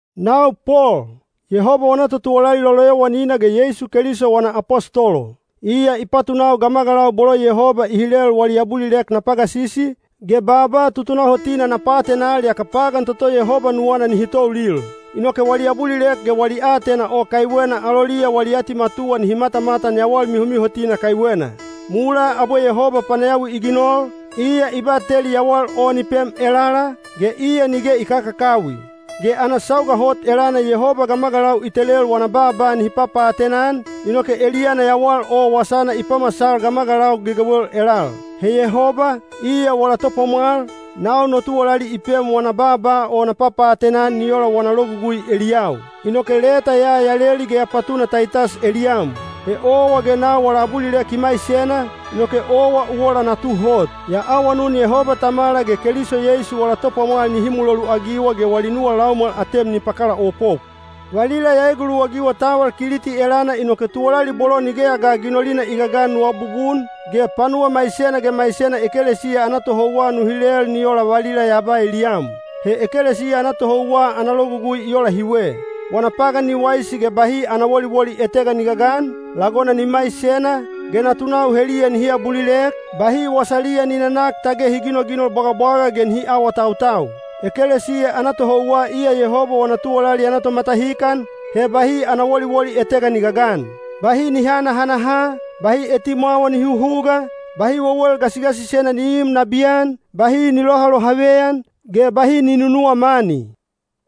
Nau Pol, Yehoba wana totuwalali loloyowanina ge Yeisu Keliso wana apostolo. Iya i patunau gamagalau bolo Yehoba i hilel wali abulilek na pagasisi, ge baaba tutunahotina na paatenal yaka pagan toto Yehoba nuwana nihi toulil. Inoke wali abulilek ge wali aatena o kaiwena aloliya wali atimatuwa nihi matamatan yawal mihomihotina kaiwena. Mulaa abwe Yehoba panayawi i ginol, iya i bateli yawal o ni pem elala, ge iya nige i kakakawi. Ge ana sauga hot elana Yehoba gamagalau i telel wana baaba nihi papaatena-an, inoke eliyana yawal o wasana i pamasal gamagalau gegewel elal. He Yehoba, iya wala Topwamwal, nau no tuwalali i pem wana baaba o na papaatena-an ni ola wana logugui eliyau. Inoke leta ya ya leli ge ya patuna Taitas eliyam. He owa ge nau wala abulilek i maisena, inoke owa u ola natu hot. Ya awanun Yehoba Tamala ge Keliso Yeisu wala Topwamwal nihi muloluagiwa ge wali nuwa laumwal atem ni pakalaopop. Valila ya eguluwagiwa taval Kiliti elana inoke tuwalali bolo nigeya ga ginolina i gagan nu abubun, ge panuwa maisena ge maisena ekelesiya ana tohouwa nu hilel ni ola valila ya ba eliyam. He ekelesiya ana tohouwa ana logugui i ola hiwe: wana pagan ni waisi ge bahi ana woliwoli etega ni gagan, lagona ni maisena, ge natunau heliya nihi abulilek, bahi wasaliya ni nanak tage hi ginoginol bwagabwaga ge hi awaawatautau. Ekelesiya ana tohouwa iya Yehoba wana tuwalali ana tomatahikan, he bahi ana woliwoli etega ni gagan. Bahi ni hanahanaha, bahi etimwawa ni huhuga, bahi wewel gasigasisena ni iim nabiyan, bahi ni lohalohaveyan, ge bahi ni nunuwa mani.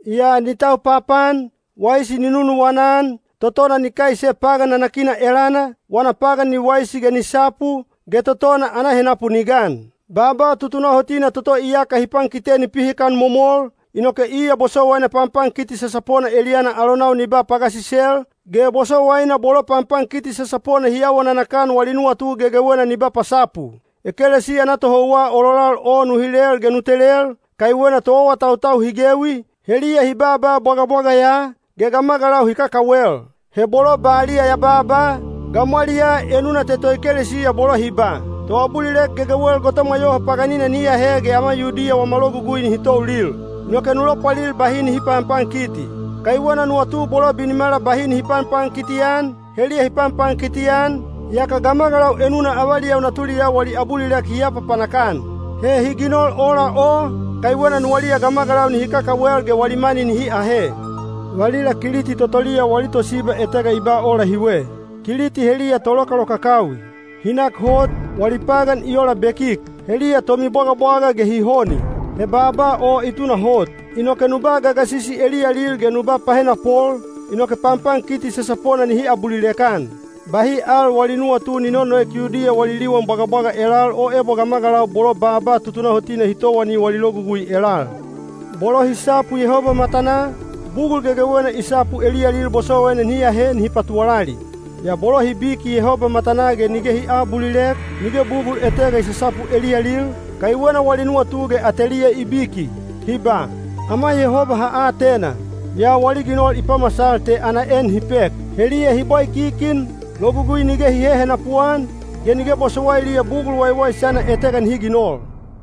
Yaa ni tau papaan, waisi ni nunuwana-an, totona ni kaise pagan nanakina elana, wana pagan ni waisi ge ni sapu, ge totona ana henapu ni gan. Baaba tutunahotina toto iyaka hi pankite ni pihikan momol, inoke iya bosowaina panpankiti sasapona eliyana alonau ni ba pagasisel, ge bosowaina bolo panpankiti sasapona hi awa nanakan wali nuwatu gegegena ni ba pasapu. Ekelesiya ana tohouwa ololal o nu hilel ge nu telel, kaiwena toawatautau hi gewi, heliya hi baaba bwagabwaga ya, ge gamagalau hi kakawel. He bolo baliya ya baaba, gamwaliyaa enuna te toekelesiya bolo hi ba, “Toabulilek gegewel gotomwa yoho paganina nihi ahe ge ama Yudiya wama logugui nihi toulil.” Inoke nu lopwalil bahi nihi panpankiti, kaiwena nuwatu bolo binimala bahi nihi panpankiti-an, heliya hi panpankiti-an, yaka gamagalau enuna avaliyau natuliyau wali abulilek hi apapanak-an. He hi ginol ola o, kaiwena nuwaliya gamagalau nihi kakawel ge wali mani nihi ahe. Valila Kiliti totoliya wali tosiba etega i ba ola hiwe: “Kiliti heliya tolokalokakawi. Hi nak hot, wali pagan i ola bekik. Heliya tomibwagabwaga ge hi honi.” He baaba o i tunahot. Inoke nu ba gagasisi eliyalil ge nu ba pahenapol, inoke panpankiti sasapona nihi abulilek-an. Bahi al wali nuwatu ni nonoek Yudiya wali liwan bwagabwaga elal o ebo gamagalau bolo baaba tutunahotina hi towani wali logugui elal. Bolo hi sapu Yehoba matanaa, bugul gegewena i sapu eliyalil bosowaina nihi ahe nihi patuwalali. Yaa bolo hi biki Yehoba matanaa ge nige hi aabulilek, nige bugul etega i sasapu eliyalil, kaiwena wali nuwatu ge ateliya i biki. Hi ba, “Ama Yehoba ha atena,” yaa wali ginol i pamasal te ana en hi pek. Heliya hi bwaikikin, logugui nige hi hehenapu-an, ge nige bosowailiya bugul waiwaisana etega nihi ginol.